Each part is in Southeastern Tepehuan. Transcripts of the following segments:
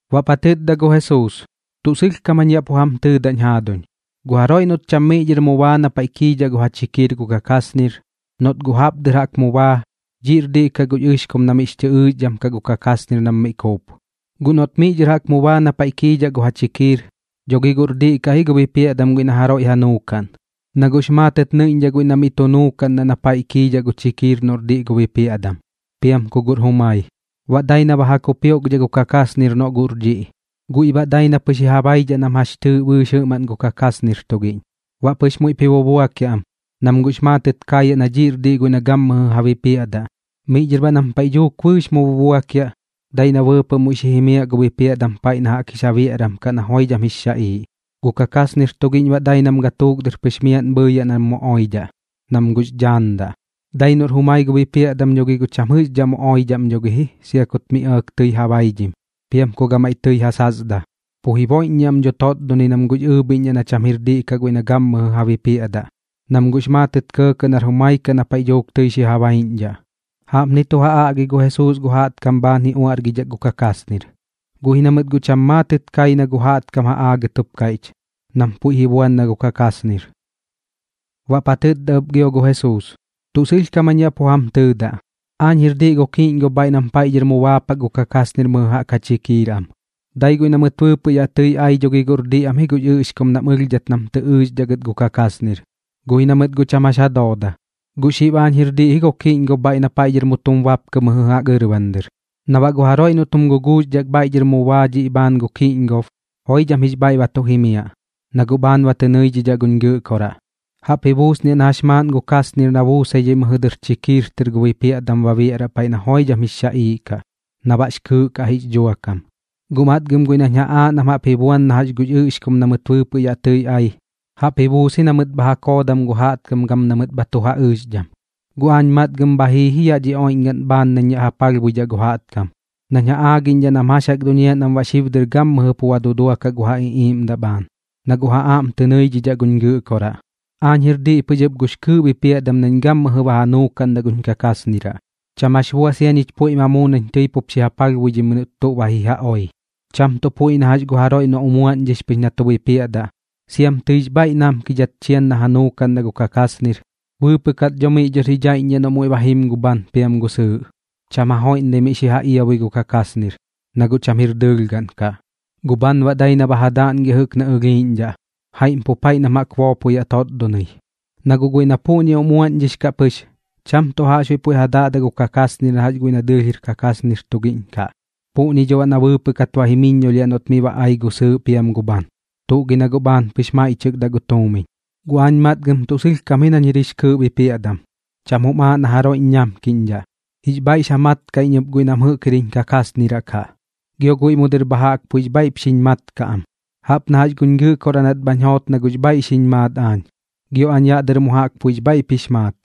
Baꞌp ja tɨtda gu Jesuus: ―Tuꞌ sɨlhkam jañ yaꞌ pu jam tɨɨdaꞌñ jaaduñ, gu jaroiꞌ noꞌt cham miꞌ dhɨr mu baa na paiꞌ kiidhaꞌ gu ja chikiir gu kakasnir, noꞌt guꞌ jaꞌp dɨr jaꞌk mu baa, dhiꞌr diꞌ kaꞌ gux ɨxkum na miꞌx chɨ ɨɨxdham kaꞌ gu kakasnir nam mi kuup. Guꞌ noꞌt miꞌ dhɨr jaꞌk mu baa na paiꞌ kiidhaꞌ gu ja chikiir, dho gi guꞌr diꞌ kaꞌ ji gu bipiaꞌdam guiꞌ na jaroiꞌ ja nuukaꞌn, na guꞌx maatɨt nɨiꞌñdhaꞌ guiꞌ na miꞌ tu nuukaꞌndaꞌ na paiꞌ kiidhaꞌ gu chikiir noꞌr diꞌ gu bipiaꞌdam, piam ku guꞌr jumai. Baꞌ dai na ba ja kupioꞌkdhaꞌ gu kakasnir noꞌ guꞌr dhiꞌ, guiꞌ baꞌ dai na pɨx ji ja baidhaꞌ nam jax chɨɨꞌ bɨɨx jɨꞌmaꞌn gu kakasnir tugiꞌñ. Baꞌ pɨx muiꞌp ji bubuakiaꞌ am, nam guꞌx maatɨt kaayaꞌ na dhiꞌr diꞌ guiꞌ na gammɨjɨ ja bipiaꞌdaꞌ. Miꞌ dhɨr baꞌ nam paiꞌ dhuuk bɨɨx mu bubuakiaꞌ, dai na bɨɨpɨꞌ muiꞌ xi jimiaꞌ gu bipiaꞌdam paiꞌ na jaꞌk jix ja biaꞌram kaꞌ na joidham jix xaꞌiiꞌ, gu kakasnir tugiꞌñ baꞌ dai nam gatuuk dɨr pɨx miaꞌn bhɨɨyaꞌ nam mu oidhaꞌ, nam guꞌx dhaandaꞌ. Dai noꞌr jumai gu bipiaꞌdam dho gi guꞌ cham jɨꞌxdhaꞌ mu oidhaꞌ am dho gi ji sia kut mi ɇɇk tɨi ja baidhim, piam ku gamaiꞌ tɨi ja sasdaꞌ. Pu jiboiꞌññiaꞌ am dho totdonɨi nam guꞌx ɨɨbhiꞌñdhaꞌ na cham jir diꞌ kaꞌ guiꞌ na gammɨjɨ ja bipiaꞌdaꞌ, nam guꞌx maatɨt kɇɇkɇꞌ nar jumai kaꞌ na paiꞌ dhuuk tɨi xi ja baiꞌñdhaꞌ. Jaꞌpni tu ja aꞌgi gu Jesuus gu jaꞌtkam bhaan ji uaꞌrgidhak gu kakasnir, guꞌ ji na mɨt guꞌ pu cham maatɨt kai na gu jaꞌtkam ja aagɨt jup kaiꞌch, nam puiꞌ ji buan na gu kakasnir. Baꞌp ja tɨtda ɨp gio gu Jesuus: ―Tuꞌ sɨlhkam jañ yaꞌ pu jam tɨɨdaꞌ, aañ jir diꞌ gu kiꞌñgob bhaiꞌ nam paiꞌ dhɨr mu baapak gu kakasnir mɨjɨ jaꞌk ja chikiir am. Dai guiꞌ na mɨt bɨɨpɨꞌ yaꞌ tɨi ai dho gi guꞌr diꞌ am ji gux ɨꞌxkum nam ɨlhdat nam tɨ ɨɨxdhaꞌ gɨt gu kakasnir, guꞌ ji na mɨt guꞌ cham jax ja dooda. Guꞌ xib aañ jir diꞌ ji gu kiꞌñgob bhaiꞌ na paiꞌ dhɨr mu tum bapkɨ mɨjɨ jaꞌk ɨrban dɨr, na baꞌ gu jaroiꞌ noꞌt jum guguuxdhak bhaiꞌ dhɨr mu baa dhiꞌ bhaan gu kiꞌñgob, joidham jix bhaiꞌ ba tu jimiaꞌ, na guꞌ bhaan ba tɨ nɨidhidhaꞌ guñ Gɨꞌkoraꞌ. Jaꞌp ji buusniaꞌ na jax maaꞌn gu kasnir na buusaidhai mɨjɨ dɨr chikiir tɨr gu bipiaꞌdam ba biaꞌraꞌ paiꞌ na joidham jix xaꞌiiꞌ kaꞌ, na baꞌx kɨɨꞌ kaꞌ jix dhuakam. ’Guꞌ matgam guiꞌ nañ ja aaꞌ nam jaꞌp ji buan na gux ɨꞌxkum na mɨt bɨɨpɨꞌ yaꞌ tɨi ai, jaꞌp ji buus ji na mɨt bha ja koodam gu jaꞌtkam gam na mɨt bha tu ja ɨɨxdham. Guꞌ aañ matgam bha jii ji yaꞌ dhi oiꞌñgaꞌn bhaan nañ yaꞌ ja palhbuidhaꞌ gu jaꞌtkam, nañ ja aagiꞌñdhaꞌ nam jax jaꞌk duñiaꞌ nam baꞌ xib dɨr gammɨjɨ pu ba duduakaꞌ gu ja iꞌiiꞌmdaꞌ bhaan, na guꞌ ja aꞌm tɨ nɨidhidhaꞌ guñ Gɨꞌkoraꞌ. Aañ jir diꞌ pɨx ɨp gux kɨɨꞌ bipiaꞌdam nañ gammɨjɨ ba ja nuukaꞌndaꞌ guñ kakasniraꞌ, cham jax bua sia ñich puiꞌ ma muu nañ tɨi pup xi ja palhbuidhimɨi noꞌt tuꞌ ba ji ja oi. Cham tuꞌ puiꞌ na jax gu jaroiꞌ noꞌ umuaꞌñdhix pɨx na tu bipiaꞌdaꞌ, siam tɨix bhaiꞌ namkidhat chian na ja nuukaꞌndaꞌ gu kakasnir. Bɨɨpɨꞌ kat dho miꞌ dhɨr ji dhaiꞌññiaꞌ noꞌ muiꞌ ba jim gu bhan piam gu sɨɨꞌ. Cham ja joiꞌndai miꞌ xi ja iabui gu kakasnir, na guꞌ cham jir dɨɨlh gaꞌn kaꞌ. Gu bhan baꞌ dai na ba ja daꞌngiaꞌ jɨꞌk na ɨlhiiꞌñdhaꞌ, jaiꞌm pu paiꞌ nam jaꞌk boopoyaꞌ totdonɨi. Na guꞌ guiꞌ na puꞌñi umuaꞌñdhix kaꞌ pɨx, cham tuꞌ jaꞌxbuiꞌ puiꞌ ja daꞌdaꞌ gu kakasnir na jax guiꞌ na dɨɨlh jir kakasnir tugiꞌñ kaꞌ. Puꞌñi dho baꞌ na bɨɨpɨꞌ kat ba jimiññolhiaꞌ noꞌt miꞌ ba ai gu sɨɨꞌ piam gu bhan. Tuꞌ gi na guꞌ bhaan pɨx maiꞌchɨkdaꞌ gu tuumiñ. ’Guꞌ aañ matgam tuꞌ sɨlhkam ji nañ jir jix kɨɨꞌ bipiaꞌdam, cham jum aaꞌ na jaroiꞌñ ñamkiꞌñdhaꞌ. Jix bhaiꞌx ja mat kaꞌ iñ ɨp guiꞌ nam jɨꞌk jir jiñ kakasniraꞌ kaꞌ, gio guiꞌ mu dɨr bha jaꞌk puiꞌx bhaiꞌp xiñ mat kaꞌ am. Jaꞌp na guñ Gɨꞌkoraꞌ nat bhañ joot na guꞌx bhaiꞌ xiñ maat aañ, gio aañ yaꞌ dɨr mu jaꞌk puiꞌx bhaiꞌp jix maat.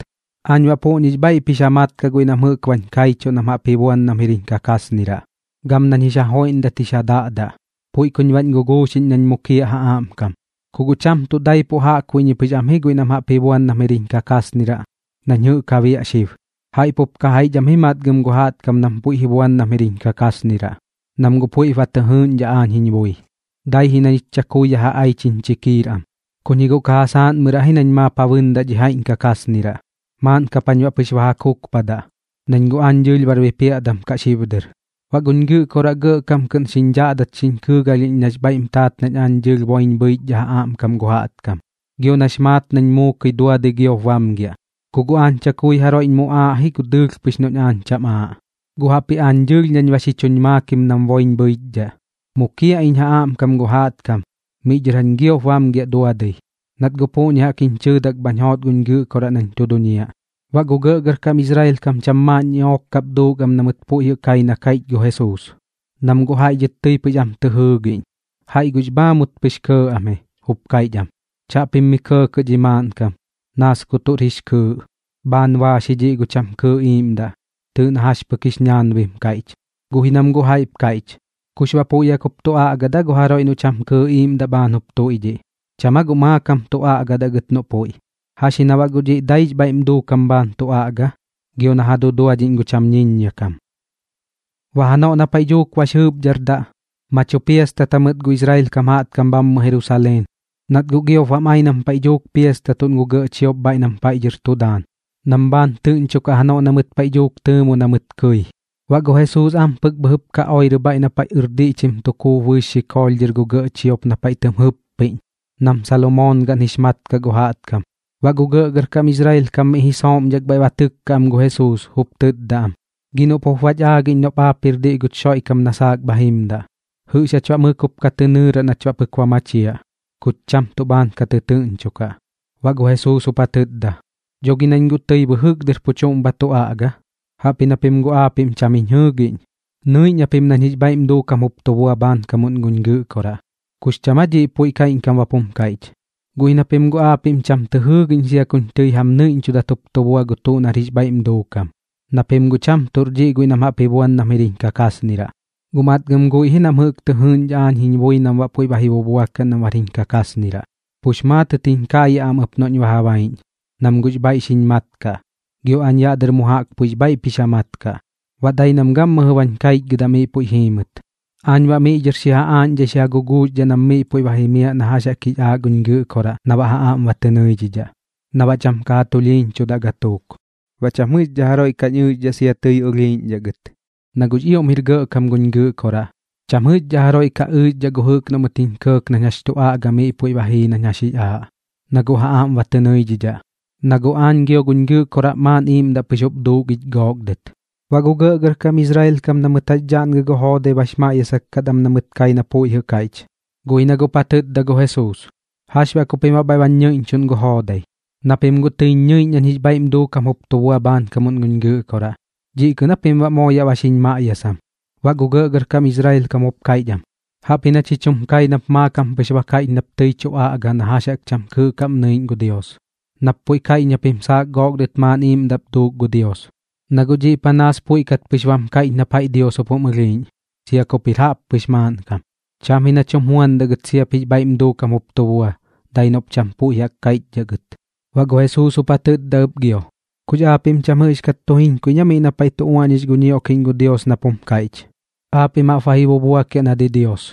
Aañ baꞌ puꞌñix bhaiꞌp jix ja mat kaꞌ guiꞌ nam jɨꞌk bañ kaichuꞌ nam jaꞌp ji buan nam jir jiñ kakasniraꞌ, gam nañ jix ja joiꞌndat jix ja daꞌdaꞌ. Puiꞌ kuñ baꞌñ guguuxiꞌñ nañ mukiaꞌ ja aꞌmkam. Ku guꞌ cham tuꞌ daipuꞌ jaꞌkbuiꞌñi pɨx am ji guiꞌ nam jaꞌp ji buan nam jir jiñ kakasniraꞌ nañ jɨꞌk ja biaꞌ xib, jaiꞌ pup ka jaiꞌch am ji matgam gu jaꞌtkam nam puiꞌp ji buan nam jir jiñ kakasniraꞌ, nam guꞌ puiꞌp ba tɨ jɨɨꞌñdhaꞌ aañ jiñ bui. Dai ji na ñich chakui yaꞌ ja aich jiñ chikiir am, kuñ ji guꞌ ka ja saaꞌnmɨraꞌ ji nañ maap ja bɨɨndaꞌ dhi jaiꞌñ kakasniraꞌ. Maaꞌn kap jañ baꞌ pɨx ba ja kukpadaꞌ, nañ guꞌ aañ dɨɨlh bar bipiaꞌdam kaꞌ xib dɨr. ’Baꞌ guñ Gɨꞌkoraꞌ gɇꞌkam kɨꞌn xiñ dhaꞌdat xiñ kɨɨgalhiꞌñ nax bhaiꞌm taat nañ aañ dɨɨlh boiñ bhɨichdhaꞌ ja aꞌmkam gu jaꞌtkam, gio nax maat nañ muukɨi duadɨi giop bamgiaꞌ. Ku guꞌ aañ chakui jaroiꞌñ muꞌaaꞌ ji gu dɨɨlh pɨx noꞌñ aañ cham aaꞌ, guꞌ jaꞌpji aañ dɨɨlh nañ ba xi chuñ maakim nam boiñ bhɨichdhaꞌ. Mukiaꞌ iñ ja aꞌmkam gu jaꞌtkam, miꞌ dhɨr jañ giop bamgiaꞌ duadɨi, nat guꞌ puꞌñi jaꞌk jiñ chɨɨdak bhañ joot guñ Gɨꞌkoraꞌ nañ tu duñiaꞌ. Baꞌ gu gɇꞌgɇrkam Israel kam cham maaꞌn ñiꞌook kap duuk am na mɨt puiꞌ jɨꞌ kai na kaiꞌch gu Jesuus, nam guꞌ jaiꞌ dhɨt tɨi pɨx am tɨ jɨɨgiꞌñ. Jaiꞌ guꞌx bhaamut pɨx kɇɇ am ji, jup kaiꞌch am: ―Chaꞌpim mi kɇɇkɇꞌ dhi maaꞌnkam. Naas ku tuꞌr jix kɨɨꞌ. Bhaan baax ji dhiꞌ gu cham kɨɨꞌ iiꞌmdaꞌ. Tɨɨꞌ na jax pɨk jix ñaanbim kaiꞌch. Guꞌ ji nam guꞌ jaiꞌp kaiꞌch: ―¿Kux baꞌ puiꞌ jaꞌk jup tu aꞌgadaꞌ aa gu jaroiꞌ noꞌ cham kɨɨꞌ iiꞌmdaꞌ bhaan jup tuiꞌdhiꞌ? ¿Cham aa guꞌ maakam tu aꞌgadaꞌ gɨt noꞌ puiꞌ? ¿Jax ji na baꞌ guꞌ dhiꞌ daix bhaiꞌm duukam bhaan tu aꞌga, gio na ja duduadhiꞌñ gu cham ñiññia kam? Baꞌ janoꞌ na paiꞌ dhuuk bax jɨɨpdhardaꞌ, ma tu piastatat jamɨt gu Israel kam jaꞌtkam bhammɨ Jerusaleen, nat guꞌ giop bam ai nam paiꞌ dhuuk piastatuꞌn gu gɇꞌ chiop bhaiꞌ nam paiꞌ dhɨr tu daan, nam bhaan tɨꞌñchokaꞌ janoꞌ na mɨt paiꞌ dhuuk tɨɨmu na mɨt kɨi. Baꞌ gu Jesuus am pɨk bhɨjɨp ka oirɨ bhaiꞌ na paiꞌ ɨrdiꞌchim tu kuup bɨɨx xikoolh dhɨr gu gɇꞌ chiop na paiꞌ tɨm jɨppiꞌñ, nam Salomoon gaꞌn jix mat kaꞌ gu jaꞌtkam. Baꞌ gu gɇꞌgɇrkam Israel kam miꞌ ji sooꞌmdhak bhaiꞌ ba tɨkka am gu Jesuus, jup tɨtda am: ―Gi noꞌp jup bach aagiꞌñ noꞌp aap jir diꞌ guch Xoiꞌkam na saak bha jimdaꞌ. ¿Jɨꞌx jach baꞌ mɨk jup ka tɨ nɨɨraꞌ nach baꞌ pɨk ba machiaꞌ? Kuch cham tuꞌ bhaan ka tɨtɨɨꞌñchokaꞌ. Baꞌ gu Jesuus jup ja tɨtda: ―Dho gi nañ guꞌ tɨi bɨjɨk dɨr pu chuꞌm ba tu aꞌga, jaꞌpji na pim guꞌ aapiꞌm cham jiñ jɨɨgiꞌñ. Nɨiꞌñ japim ɨp nañ jix bhaiꞌm duukam jup tu bua bhaankamuꞌn guñ Gɨꞌkoraꞌ. ¿Kux cham aa dhiꞌ puiꞌ kaiꞌñkam bap jum kaiꞌch? Guꞌ ji na pim guꞌ aapiꞌm cham tɨ jɨɨgiꞌñ sia kuñ tɨi jam nɨiꞌñchudat jup tu bua na tuꞌr jix bhaiꞌm duukam, na pim guꞌ cham tuꞌr dhiꞌ guiꞌ nam jaꞌp ji buan nam jir jiñ kakasniraꞌ. Guꞌ matgam guiꞌ ji nam jɨꞌk tɨ jɨɨꞌñdhaꞌ aañ jiñ bui nam baꞌ puiꞌ ba ji bubuakiaꞌ nam bar jiñ kakasniraꞌ, pux maatɨt jiñ kaayaꞌ am ɨp noꞌñ ba ja baiꞌñ, nam guꞌx bhaiꞌ xiñ mat kaꞌ, gio aañ yaꞌ dɨr mu jaꞌk puiꞌx bhaiꞌp jix ja mat kaꞌ, baꞌ dai nam gammɨjɨ bañ kaichgɨdaꞌ miꞌ puiꞌ jiimɨt. Aañ baꞌ miꞌ dhɨr xi ja aaꞌñdhai xi ja guguuxdhaꞌ nam miꞌ puiꞌ ba jimiaꞌ na jax jaꞌk jix aaꞌ guñ Gɨꞌkoraꞌ na baꞌ ja aꞌm ba tɨ nɨidhidhaꞌ, na baꞌ cham ka ja tulhiiñchudaꞌ gatuuk. Baꞌ cham jɨꞌxdhaꞌ jaroiꞌ kañ ɨɨxdhaꞌ sia tɨi ɨlhiiꞌñdhaꞌ gɨt. Na guꞌx ioꞌm jir gɇꞌkam guñ Gɨꞌkoraꞌ, cham jɨꞌxdhaꞌ jaroiꞌ ka ɨɨxdhaꞌ gu jɨꞌk noꞌ mɨt jiñ kɇɇk nañ jax tu aꞌga miꞌ puiꞌ ba jii na jax jix aaꞌ, na guꞌ ja aꞌm ba tɨ nɨidhidhaꞌ. Na guꞌ aañ gio guñ Gɨꞌkoraꞌ maaꞌn iiꞌmdaꞌ pɨx jup duuk ich gook dɨt. Baꞌ gu gɇꞌgɇrkam Israel kam na mɨt jax daꞌngɨ gu joodai bax maꞌyasak kat am na mɨt kai na puiꞌ jɨꞌ kaiꞌch. Guꞌ ji na guꞌp ja tɨtda gu Jesuus: ―¿Jax baꞌ ku pim baꞌ bhaiꞌ bañ ñɨiꞌñchuꞌn gu joodai? Na pim guꞌ tɨiñ ñɨiꞌñ nañ jix bhaiꞌm duukam jup tu bua bhaankamuꞌn guñ Gɨꞌkoraꞌ. ¿Dhiꞌ kɨꞌn aa pim baꞌ moo yaꞌ ba xiñ maꞌyasam? Baꞌ gu gɇꞌgɇrkam Israel kam jup kaiꞌch am: ―Jaꞌpji na chich jum kai nap maakam pɨx ba kaiꞌch nap tɨi tu aꞌga na jax jaꞌk cham kɨɨꞌ kaꞌm nɨiꞌñ gu Dios, nap puiꞌ kaiꞌch na pim saak gook dɨt maaꞌn iiꞌmdaꞌp duuk gu Dios. Na guꞌ dhiꞌ panaas puiꞌ kat pɨx bap jum kaiꞌch nap jaiꞌ Dios jup jum ɨlhiiꞌñ, sia kup jir jaꞌppɨx maaꞌnkam. Cham ji nach jum juandaꞌ gɨt siap jix bhaiꞌm duukam jup tu bua, dai noꞌp cham puiꞌ jaꞌk kaiꞌchdhaꞌ gɨt. Baꞌ gu Jesuus jup ja tɨtda ɨp gio: ―¿Kux aapiꞌm cham jɨꞌxkat tu jiñkaiꞌñ aa miꞌ na paiꞌ tu uaꞌñix gu ñioꞌkiꞌñ gu Dios, nap jum kaiꞌch: “Aapiꞌm jaꞌp ba ji bubuakiaꞌ na didios”?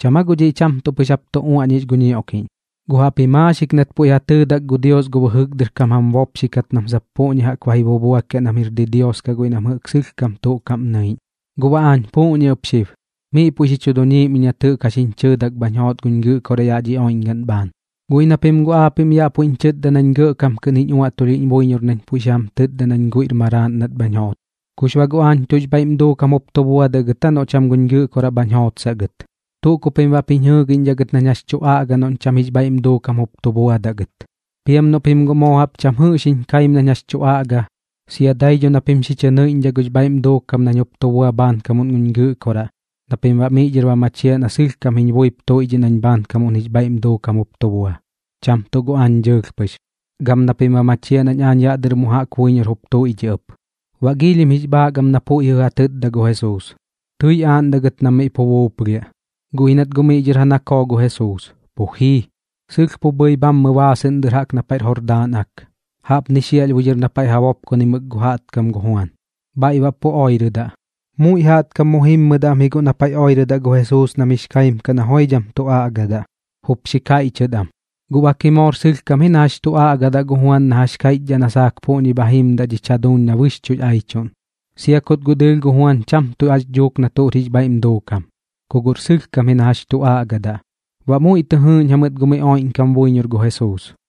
¿Cham aa guꞌ dhiꞌ cham tuꞌ pɨx jap tu uaꞌñix gu ñioꞌkiꞌñ? Guꞌ jaꞌpji maaxik ji puiꞌ ja tɨɨdak gu Dios gu bɨjɨk dɨr kam jam bopxi kat nam sap puꞌñi jaꞌp ji bubuakiaꞌ nam jir didios kaꞌ guiꞌ nam jɨꞌk sɨlhkam tuꞌ kaꞌm nɨiꞌñ. Guꞌ baꞌ aañ puꞌñi ɨp xib, miꞌ puiꞌ xi chu duñiim iñ nat jɨꞌk jax jiñ chɨɨdak bhañ joot guñ Gɨꞌkoraꞌ yaꞌ dhi oiꞌñgaꞌn bhaan. Guꞌ ji na pim guꞌ aapiꞌm yaꞌ puiꞌñ chɨtda nañ gɇꞌkam kɨꞌn jiñ uaꞌtulhiꞌñ buiñor nañ puiꞌ xi jam tɨtda nañ guiꞌr maraaꞌn nat bhañ joot. ¿Kux baꞌ guꞌ aañ tuꞌx bhaiꞌm duukam jup tu buadaꞌ gɨt aa noꞌ cham guñ Gɨꞌkoraꞌ bhañ jootsaꞌ gɨt? Tuꞌ ku pim baꞌp jiñ jɨɨgiꞌñdhaꞌ gɨt nañ jax tu aꞌga noꞌñ cham jix bhaiꞌm duukam jup tu buadaꞌ gɨt. Piam noꞌ pim guꞌ moo jaꞌp cham jɨꞌx jiñ kaim nañ jax tu aꞌga, sia dai dho na pim xi chɨ nɨiꞌñdhaꞌ gux bhaiꞌm duukam nañ jup tu bua bhaankamuꞌn guñ Gɨꞌkoraꞌ na pim baꞌ miꞌ dhɨr ba machiaꞌ na sɨlhkam jiñ buip tuiꞌdhiꞌ nañ baꞌ bhaankamuꞌn jix bhaiꞌm duukam jup tu bua, cham tuꞌ gu aañ dɨɨlh pɨx, gam na pim baꞌ ba machiaꞌ nañ aañ yaꞌ dɨr mu jaꞌk buiñor jup tuiꞌdhiꞌ ɨp. Baꞌ giilhim jix bhaak am na puiꞌ jɨꞌ ja tɨtda gu Jesuus. Tɨi aaꞌndaꞌ gɨt nam miꞌ pu buuplhiaꞌ, guꞌ ji nat guꞌ miꞌ dhɨr ja nakoo gu Jesuus, pu jii. Sɨlh pu bhɨi bhammɨ baasɨꞌn dɨr jaꞌk na paiꞌr Jordaan Ak, jaꞌpni xiaꞌlhbui dhɨr na paiꞌ ja bopkonimɨk gu jaꞌtkam gu Juan, bhaiꞌ baꞌ pu oirɨdaꞌ. Muiꞌ jaꞌtkam mu jimmɨdaꞌ am ji guꞌ na paiꞌ oirɨdaꞌ gu Jesuus nam jix kaim kaꞌ na joidham tu aꞌgadaꞌ, jup xi kaiꞌchɨt am: ―Guꞌ bak ji moor sɨlhkam ji na jax tu aꞌgadaꞌ gu Juan nap kaiꞌchdhaꞌ na saak puꞌñi bha jimdaꞌ dhich jaduuñ na bɨxchuꞌx aichuꞌn. Sia kut guꞌ dɨɨlh gu Juan cham tuꞌ jax dhuuk na tuꞌr jix bhaiꞌm duukam, ku guꞌr sɨlhkam ji na jax tu aꞌgadaꞌ. Baꞌ muiꞌ tɨ jɨɨꞌñ jamɨt gu miꞌ oiꞌñkam buiñor gu Jesuus.